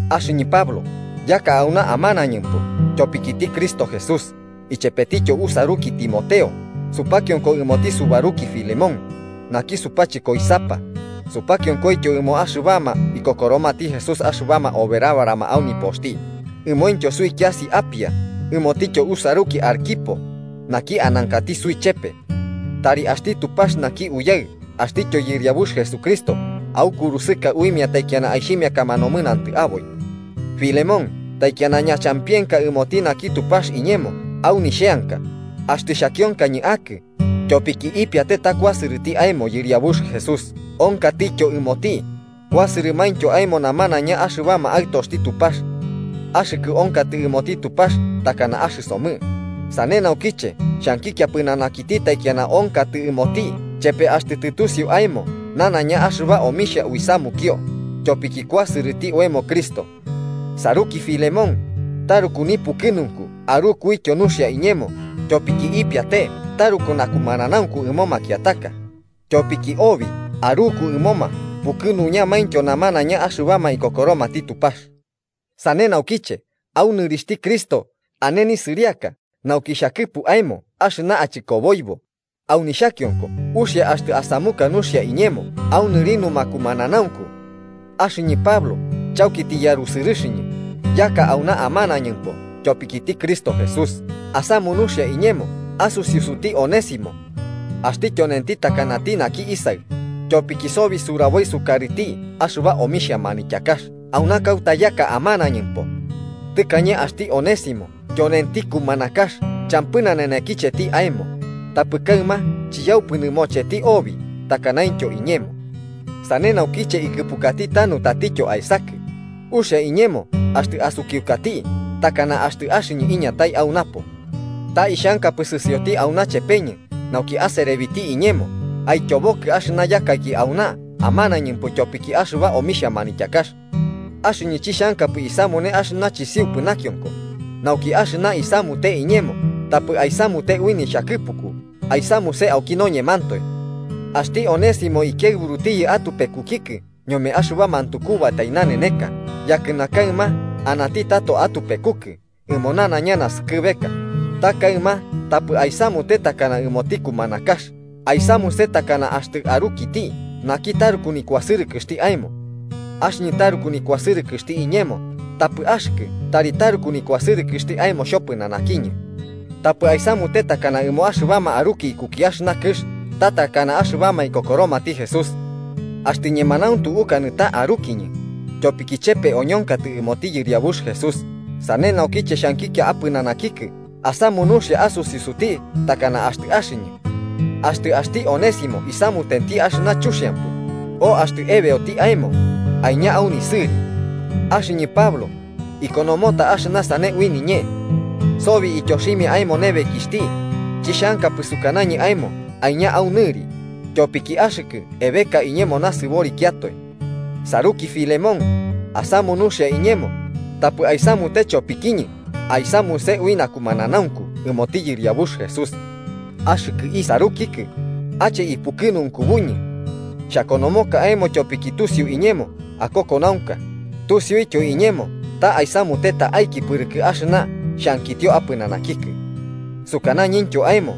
Axɨñɨ Pablo, yaka auna amanañɨmpo tyopikiti Cristo Jesús, ichepetityo usaruki Timoteo supakionko ɨmoti subaruki Filemón, naki supachɨkoisapa, supakionkoityo ɨmoma axɨbama ikokoromati Jesús axɨbama oberabarama au nipoxti, ɨmointyo suikiasi Apia ɨmotityo usaruki Arquipo, naki anankati suichepe. Tari axti Tupax naki Uyaɨ axtityo Yɨriabux Jesucristo aukurusɨka uimia taikiana aixhimiakama nomɨnantɨ aboi. Filemón taikiana ñachampienkaka ɨmoti naki Tupax iñemo au nixheanka, axtɨ xhakionkañɨ akɨ, tyopiki ipiate ta kuasɨrɨti aemo Yɨriabux Jesús onkatityo ɨmoti, kuasɨrɨmaintyo aemo namanaiña axɨbama aɨtoxti Tupax. Axɨkɨ onkatɨ ɨmoti Tupax takana axɨsomɨ, sane naukiche xhankikia pɨnanakiti taikiana onkatɨ ɨmoti chepe axtɨ tɨtusiu aemo nanaiña axɨba omixhia uisamunio tyopiki kuasɨrɨti oemo Cristo. Saruki Filemón, taruku nipukɨnunku arukuityo nuxia iñemo tyopiki ipiate taruku nakumananaunku ɨmo makiataka, tyopiki obi, aruku ɨmoma pukɨnuñamaintyo namanaiña axɨbama ikokoromati Tupax. Sane naukiche, au nɨrixhti Cristo ane nisɨriaka nauki xhakɨpu aemo axɨna achɨkoboibo, au nixhakionko uxia axtɨ asamuka nuxia iñemo au nɨri numakumananaunku. Axɨñɨ, Pablo, chauki tiyarusɨrɨxɨñɨ, yaka auna amanañɨmpo tyopikiti Cristo Jesús, asamu nuxia iñemo asusiusuti Onésimo. Axti tyonenti takanati naki isaɨ, tyopiki sobi suraboi sukarɨti axɨba omixhia manityakax auna kauta yaka amanañɨmpo. Tɨkañe, axti Onésimo tyonenti kumanakax champɨ nanenekicheti aemo, tapɨ kaɨma chiyaupɨ nɨmocheti obi takanaintyo iñemo. Sane naukiche ikɨpukati tanu tatityo aesakɨ: uxia iñemo axtɨ asukiukati takana axtɨ axɨñɨ iñatai au napo. Ta ixhankapɨ sɨsioti auna chepeñɨ, nauki aserebiti iñemo aityobokɨ axɨna yakaiki auna amanañɨmpo tyopiki axɨba omixhia manityakax. Axɨñɨ chixhankapɨ isamune axɨna chisiupɨ nakionko, nauki axɨna aisamute iñemo tapɨ aisamute ui nixhakɨpuku aisamuse auki noñemantoe. Axti Onésimo ikiaɨburutiyɨ atupekukikɨ ñome axɨba mantukubatai naneneka yakɨna kaɨma anati tato atupekukɨ ɨmo nanaiña naskɨbeka, ta kaɨma tapɨ aisamute takana ɨmoti kumanakax, aisamuse takana axtɨ arukiti naki taruku nikuasɨrɨkɨxti aemo. Axɨñɨ taruku nikuasɨrɨkɨxti iñemo, tapɨ axɨkɨ tari taruku nikuasɨrɨkɨxti aemo xhopɨnanakiñɨ. Tapɨ aisamute takana ɨmo axɨbama aruki ikuki axɨna kɨx ta takana axɨbama ikokoromati Jesús. Axtɨ ñemanauntu ukanɨ ta arukiñɨ, tyopiki chepe oñonkatɨ ɨmoti Yɨriabux Jesús, sane naukiche xhankikia apɨnanakikɨ asamu nuxia asusiusuti takana axtɨ axɨñɨ. Axtɨ axti Onésimo isamutenti axɨna chuxiampɨ, o axtɨ ebeoti aemo, aiña au nisɨri. Axɨñɨ, Pablo, ikonomota axɨna sane ui niñee: Sobi ityoximia aemo nebekixhti. Chixhankapɨ sukanañɨ aemo aiña au nɨri, tyopiki axɨkɨ ebeka iñemo nasɨborikiatoe. Saruki Filemón, asamu nuxia iñemo, tapɨ aisamute chopikiñɨ aisamuse ui nakumananaunku ɨmoti Yɨriabux Jesús. Axɨkɨ isarukikɨ: ¡ache ipukɨnunkubuñɨ! Xhakonomoka aemo tyopiki tusiu iñemo akokonaunka, tusiuityo iñemo ta aisamute ta'aiki pɨrɨkɨ axɨna xhankitio apɨnanakikɨ. Sukanañɨntyo aemo,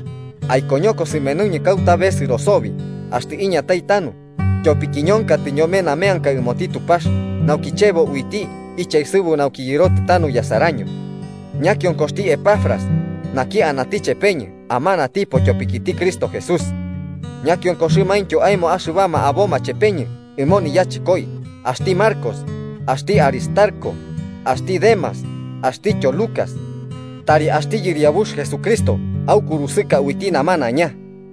aikoñoko sɨmenuñɨ kauta besɨro sobi axtɨ iñatai tanu, tyopiki ñonkatɨ ñome nameanka ɨmoti Tupax nauki chebo uiti ichaesɨbu nauki yɨrotɨ tanu yasaraño. Ñakionkoxti Epafras, naki anati chepeñɨ amanatipo tyopikiti Cristo Jesús, ñakionkoxɨmaintyo aemo axɨbama aboma chepeñɨ ɨmo niyachɨkoi axti Marcos, axti Aristarco, axti Demas axtityo Lucas. Tari axti Yɨriabux Jesucristo aukurusɨka uiti namanaiña.